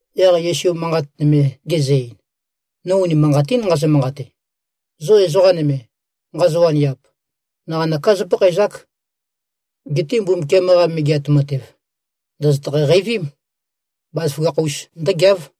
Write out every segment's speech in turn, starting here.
Yaq Yesu manqat nøme gezø-ein, “No unimanqatín nqazø-manqate. Zo ezoqa nøme, nqazo-waniap, naqanøká zópakhaezák. Geté Mbumbukiam-qa Megeat Matev ndòzotøkhæ-qeivím. Bazaføgakh-us ndǿgeáv.”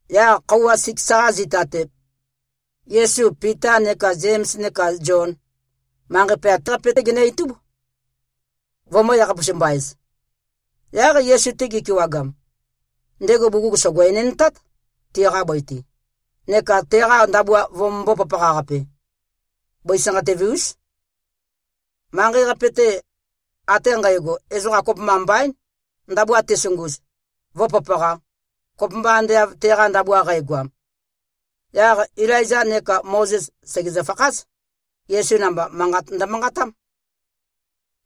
Yaq khøuwa siks-qa zita-te, Yesu, Pita neka Zems neka Zion, manqei poyat-qape-té genø-itúb, vømø̄-yakhapus-mba-ez. Yaq Yesu-te gi꞉kewagam, ndego bugug sògo-enendtát, tiqa bøi-te, neka teqa ndabua vømømbō-papaqa-qape. Bøi sanqatøve-ús. Manqei-qape-te ate nqægo, ezoqa kopømba mbaín, ndabua tezunguz, vǿpapaqā, kopømba ande av teqa ndabua qægoam. Yaq Ilaizā neka Mozes, sègezø-fakház. Yesu namba, manqat ndømanqatám.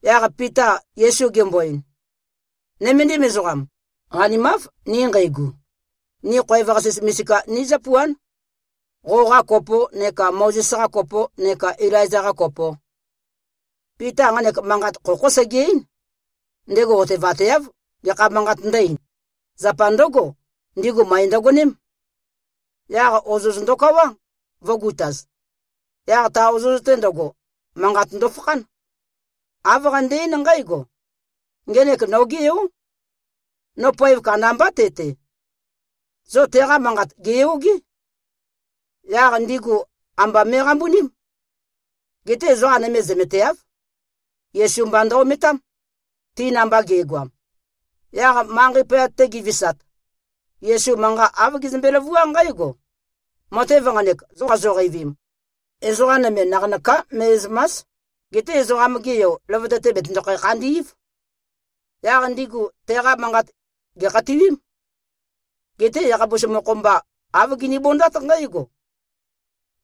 Yaq Pita Yesu gembo-ein, “Nøméndim ezoqam. Qanimáv, ni nqeigu. Ni khoev-qasis misika nizǿpuán, qoqa kopo neka Mozes-qa kopo neka Ilaiza-qa kopo.” Pita nqanek manqat khokhó sege-eín. Ndego otevateáv gekha manqat ndǿ-eīn. Zapa ndǿgo, ndigu møe ndøgoném. Yaq ozoz ndokawá, vø̄gutaz. Yaq ta ozoz-te ndøgo, manqat ndofakhán. Āv qande-eín nqǽgo, “Ngenek nogé Yó. No poev kandambá te-te. Zo teqa manqat gèyogé.” Yaq ndigu amba me꞉qambuním. Geté ezoqa nøme zømeteáv. Yesu mba ndø-ometám, ti namba ge꞉goam. Yaq manqei poyat-te gi꞉visat, Yesu manqa āv gezømbe-løvuá nqǽgo, “Matev nqanek, zo qazoqeivim, ezoqa nøme naqanøká me꞉zø̀ma᷄s. Geté Ezoqam-ge Yo, løvøte-te bètøndokhæ-khandí꞉v.” Yaq ndigu teqa manqat gèkhatiwím. Geté yakhapus mokho-mba, āv ginibondát nqǽgo,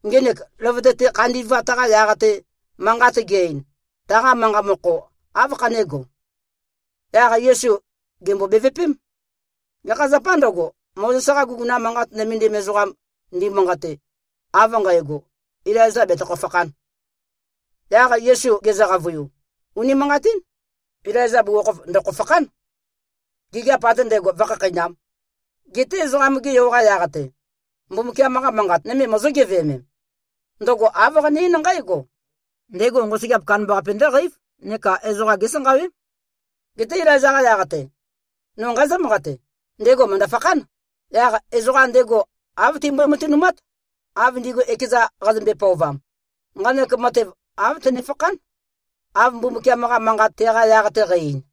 “Ngenek løvøte-te khandi꞉vat-qa yaq-te, manqat ge-ein, taqa manqa mokho áv khanégo?” Yaq Yesu gèmbo-bevøpém, “Gekha zapâ ndøgo, Mozes-qa guguna manqat nømendim ezoqam ndimanqate, av nqægo, ‘Ilaiza betøkho-fakhān.’?” Yaq Yesu gezø-qavøiu, “Unimanqatín, Ilaiza bugukhokhof ndø̀kho-fakhán, gigiap ate ndægo vǿkhakheinām. Geté Ezoqam-ge Yo-qa yaq-te, Mbumbukiam-qa Manqat nøme mozó-geveømem? Ndøgo āv qane-eín nqǽgo, ‘Ndego nqosøgeap kandambaqape ndǿqeív neka ezoqa gésanqawém.’ Geté Ilaiza-qa yaq-te, no nqazǿ-manqate: Ndego mø̀ndø-fakhán. Yaq ezoqam ndego, āv timbøe-matønumát, av ndigu ekeza qazømbe-pøovam. Nqanek matev āv tønefakhán, av Mbumbukiam-qa Manqat teqa yaq-te qæ-ein.”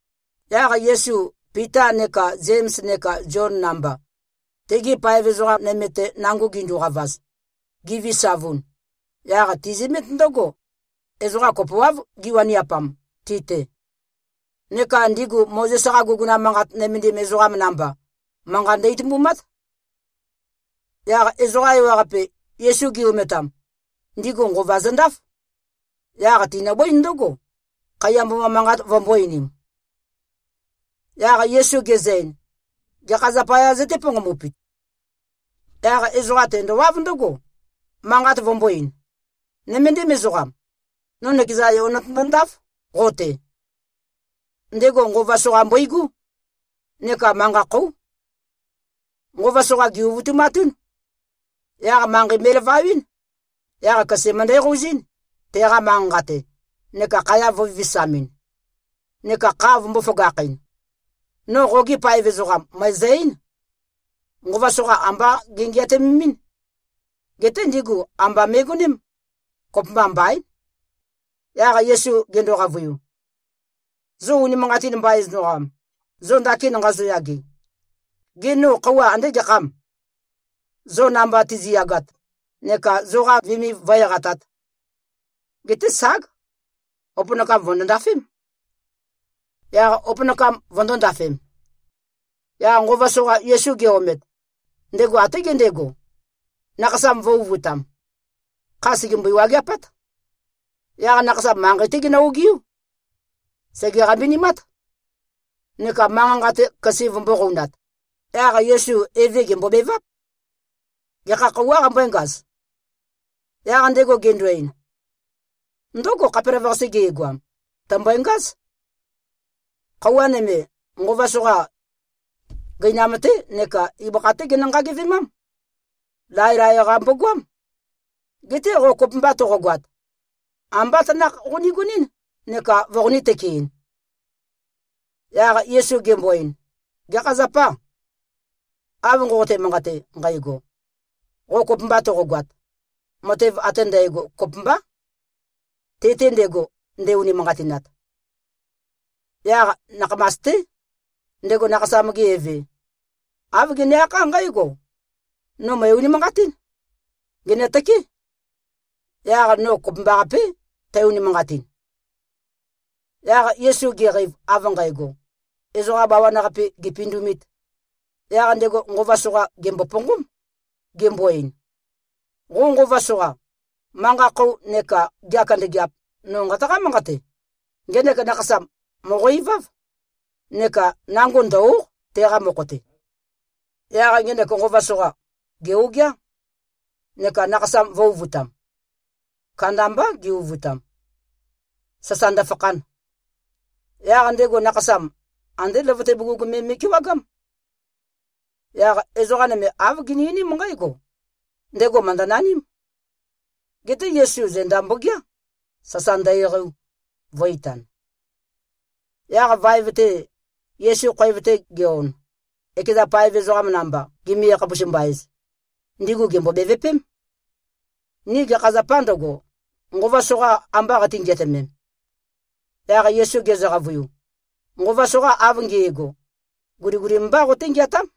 Yaq Yesu, Pita neka Zems neka Zion namba, tegi paev ezoqa nøme-te nango ginduqavaz, givisavun, yaq tizømét ndǿgo, ezoqa kopoáv giwaniapam ti-te. Neka ndigu Mozes-qa guguna manqat nømendim ezoqam namba, manqa ndø-itumbumát. Yaq ezoqa ewaqape, Yesu gi-ometam, ndigu nqova zøndáf. Yaq tinøbǿin ndǿgo, khaiya mboma manqat vømbō-einim. Yaq Yesu gezø-ein, “Gekha zapayā zøté-ponqombupit?” Yaq ezoqa tendowáv ndǿgo, manqat vømbō-ein, “Nøméndim ezoqam. No nøkeza yo notøndo-ndáf qo-te. Ndego nqova soqa mbøigú, neka manqa khóu. Nqova soqa gè-uvutumatún. Yaq manqei me꞉lavawɨ́n. Yaq køse møndæqouzín, teqa manqa-nqa-te, neka khaya vø̄vivisamɨn, neka kha vømbō-føgakhɨn. No qogi paev ezoqam, mø̀ezø-eín. Nqova soqa ambá gengeatømemɨ́n. Geté ndigu amba me꞉goném. Kopømba mbaín.” Yaq Yesu gendo-qavøiu, “Zo unimanqatin mbain ezoqam, zo ndakin nqazoyage, gê, no khøuwa andé gekhâm, zo namba tizi꞉yagat neka zoqa viniv vǿe-eqatāt? Geté ság! Opønakam vø̀ndo-ndafém.” Yaq opønakam vøndō-ndafem. Yaq nqova soqa Yesu ge-omet, ndego até gendego, nakhasam vø̄-uvutam. Kha sègembøi-wageapát. Yaq nakhasam manqei-té genø-ogiú. Sège-qambinimát, neka manqa-nqa-te køse vømbō-qounat. Yaq Yesu eve gèmbobeváp, “Gekha khøuwā qambǿengaz?” Yaq ndego gendo-ein, “Ndǿgo, khapelavøqase ge꞉goam, tø̀mbøe-ngáz. Khøuwa nøme, nqova soqa, gøinam-té neka ibøkha-té genø-nqagevemám. Laelae-qa mbogoám. Geté qo kopømba toqogoat, ambá tanakh qoniguɨ́n neka voqonī-tøkein.” Yaq Yesu gembo-ein, “Gekha zapâ, av nqoqote-manqate nqægo, ‘Qo kopømba toqogoat?’ Matev ate ndægo kopømbá, te-te ndego, nde-unimanqatinat.” Yaq nakhamas-té, ndego nakhasam-ge eve, āv gene-akhá nqǽgo, “No mø̀e-unimanqatín. Gènøtøké. Yaq no kopømbaqapé, tæ-unimanqatin.” Yaq Yesu geqeiv, av nqægo, ezoqa bawan-qape gèpindumīt, yaq ndego nqova soqa gèmboponqóm, gembo-ein, “Qo nqova soqa, manqa-khou neka gea kandøgeap, no nqataqá-manqate. Ngenek nakhasam mòqo-iváv, neka nango ndø̀-o᷄q, teqa mokho-te.” Yaq ngenek nqova soqa, gè-ogeá, neka nakhasam vø̄-uvutam. Kandambá ge-uvutam, sasa ndøfakhan. Yaq ndego nakhasam, andé løvøte bugug me me꞉kewagám. Yaq ezoqa nøme āv gini-einím nqǽgo, “Ndego mø̀ndønaním.” Geté Yesu zenda mbogeá, sasa ndø-eqeiu, vø̄-itan. Yaq vaev-te, Yesu khoev-te ge-on, ekeza paev ezoqam namba gimi-yakhapus-mba-ez, ndigu gèmbo-bevøpém, “Ni gekha zapâ ndøgo, nqova soqa amba qati-ngeatømem?” Yaq Yesu gezø-qavøiu, “Nqova soqa av nge꞉go, guligulim mbá qoté-ngeatám.”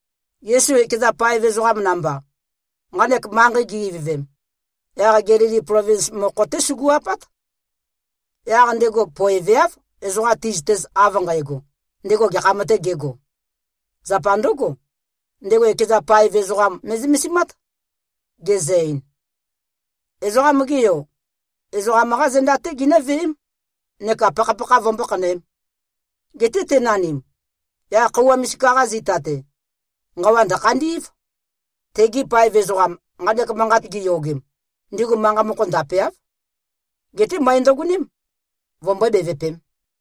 Yesu ekeza paev ezoqam namba, nqanek manqei gi-ivøvem, yaq Gelili plovins mokho-té sugu-apát. Yaq ndego poeveáv, ezoqam ti꞉zøtez av nqægo, ndego gekham-tē gego. Zapa ndǿgo, ndego ekeza paev ezoqam me꞉zømesimát. Gezø-ein, “Ezoqam-ge Yo, ezoqam-qá zenda-té ginǿveém, neka pakhapakha vømbó-khanøēm. Geté tenanim, yaq khøuwa misika-qa zita-te, nqawa ndø̀khandí꞉v.” Tegi paev ezoqam, nqanek manqat giyogem, ndigu manqa mokho ndapeáv. Geté møe ndøgoném, vømbøé-bevøpēm.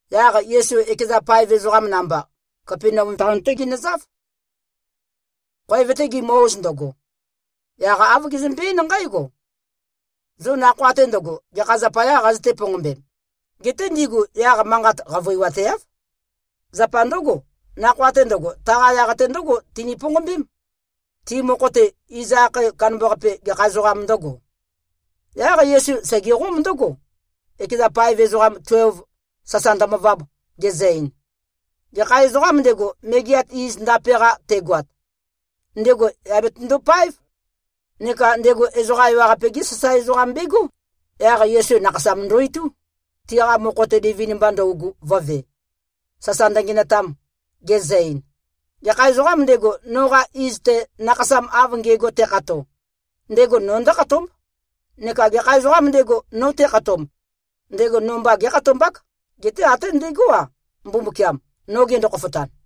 Yaq Yesu, ekeza paev ezoqam namba, Kapenaum taon-té ginøzáv. Khoev-te gimø-oz ndøgo, yaq āv gezømbe-eín nqǽgo, “Zo nakhoa-te ndøgo, gekha zapayá qazøté-ponqombem?” Geté ndigu yaq manqat qavøiwateáv. Zapa ndǿgo, nakhoa-te ndøgo, taqa yaq-te ndǿgo tini-ponqombém, ti mokho-te, iz akhae kandambaqape, gekha ezoqām ndǿgo. Yaq Yesu segeqóm ndǿgo, ekeza paev ezoqam tuelv, sasa ndømøvab, gezø-ein, “Gekha ezoqām ndego, megeat iz ndape-qa tegoat, ndego yà betøndo-páev, neka ndego ezoqa ewaqape-gé sasae ezoqam begó.” Yaq Yesu nakhasam ndo-itú, tiqa mokho-te livin-mba ndøugu vø̄ve, sasa ndøngenøtam, gezø-ein, “Gekha ezoqām ndego, noqa iz-te, nakhasam av nge꞉go tekhato, ndego no ndǿkhatómb. Neka gekha ezoqām ndego, no tekhatomb, ndego no mba gékhatombák, geté até ndegó-a, Mbumbukiam, no gendo-khofotan.”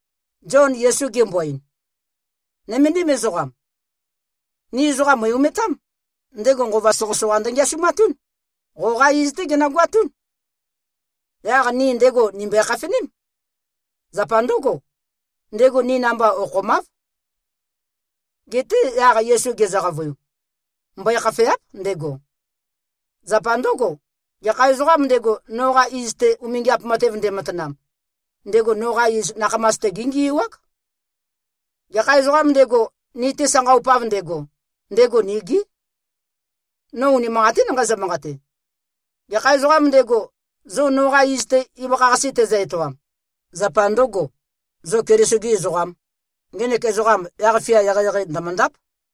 Zion Yesu gembo-ein, “Nøméndim ezoqam. Ni ezoqam mø̀i-ometám. Ndego nqova soqøsoqa ndøngeasumatún. Qoqá iz-té genøgoatún. Yaq ni ndego nìmbøe-khafeném. Zapa ndǿgo, ndego ni namba okhomáv.” Geté yaq Yesu gezø-qavøiu, “Mbøe-khafèa᷄p, ndego. Zapa ndǿgo, gekha ezoqām ndego, noqa iz-te umingiap matev ndematanam, ndego noqa iz nakhamas-te géngiuák. Gekha ezoqām ndego, ni-te sanqaupav ndego, ndego nigí. No unimanqatín nqazø-manqate. Gekha ezoqām ndego, zo noqa iz-te, ibøkha-qase tezø-etoam, zapa ndø̄go, zo Keliso-gē ezoqām, ngenek ezoqam yaq-fia eqeieqei ndø̀møndáp.”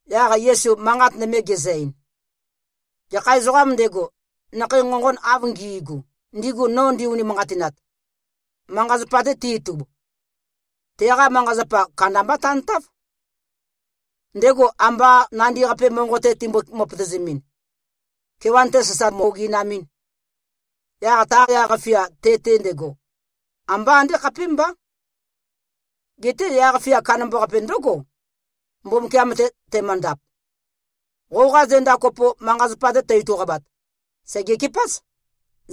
Yaq Yesu manqat nøme gezø-ein, “Gekha ezoqām ndego, nakhei nqonqon av ngi꞉gu, ndigu no ndi-unimanqatinat, manqa-zapa-te te-itub, teqa manqa-zapa kandamba tantáv. Ndego amba nandi-qape monqo-te timbo-møpøtøzemɨn, kewan-te sasa mø-oginamɨn, yaq ta yaq-fia te-te ndego, ambá andé khapémbá. Geté yaq-fia kandambaqape ndǿgo, Mbumbukiam-te temøndap. Qoqa zenda kopo, manqa-zapa-te tø-ituqabat, sègekepáz.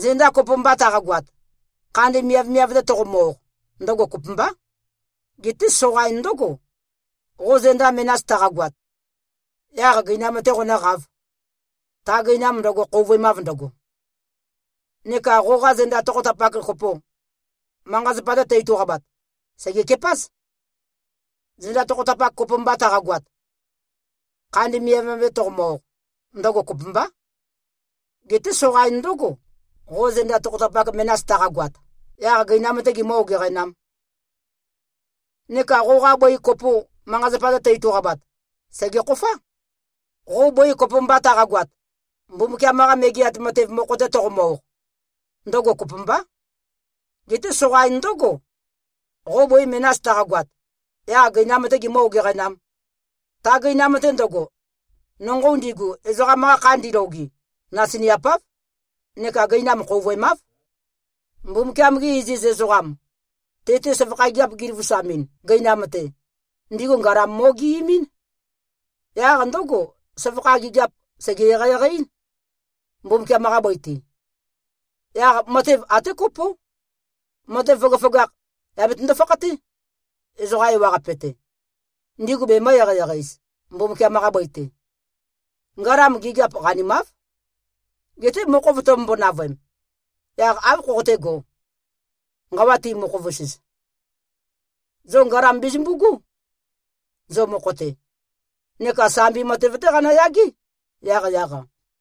Zenda kopo mba taqagoat, khandi miavmiav-te toqomø-oq, ndøgo kopømbá. Geté soqain ndǿgo, qo zenda menas taqagoat, yaq gøinam-tē qonǿqāv, ta gøinam ndøgo, khouvøemav ndøgo. Neka qoqa zenda tokhotapak kopo, manqa-zapa-te tø-ituqabat, sègekepáz. Zenda tokhotapak kopo mba taqagoat, khandi miavmiav-te toqomø-oq, ndøgo kopømbá. Geté soqain ndǿgo, qo zenda tokhotapak menas taqagoat, yaq gøinam-tē gimǿ-ogeqænām. Neka qoqa bøi kopo, manqa-zapa-te tø-ituqabat, sègekhofá. Qo bøi kopo mba taqagoat, Mbumbukiam-qa Megeat Matev mokho-te toqomø-oq, ndøgo kopømbá. Geté soqain ndǿgo, qo bøi menas taqagoat, yaq gøinam-tē gimǿ-ogeqænām. Ta gøinam-te ndøgo, nonqou ndigu, ezoqam-qa kha ndiloge, nasiniapáv, neka gøinam khouvøemáv. Mbumbukiam-gi iziz ezoqam, te-te søvakha gigiap giløvusamɨn, gøinam-te, ndigu ngalam mo꞉geemɨ́n. Yaq ndǿgo, søvakha gigiap sège-eqeieqei-ín, Mbumbukiam-qa bøi-te. Yaq matev até kopó, matev føgøføgakh yà betøndo-fakhaté, ezoqa ewaqape-te, ndigu bemø̄-eqeieqei-ez, Mbumbukiam-qa bøi-te. Ngalam gigiap qanimáv. Geté mokhov tømømbo-navøem, yaq áv khoqotégō, nqawa ti-mokhov-us-ez? Zo ngalam bezømbu꞉gú, zo mokho-te. Neka sambi matev-té qanøyagé, yaqyaq-a.”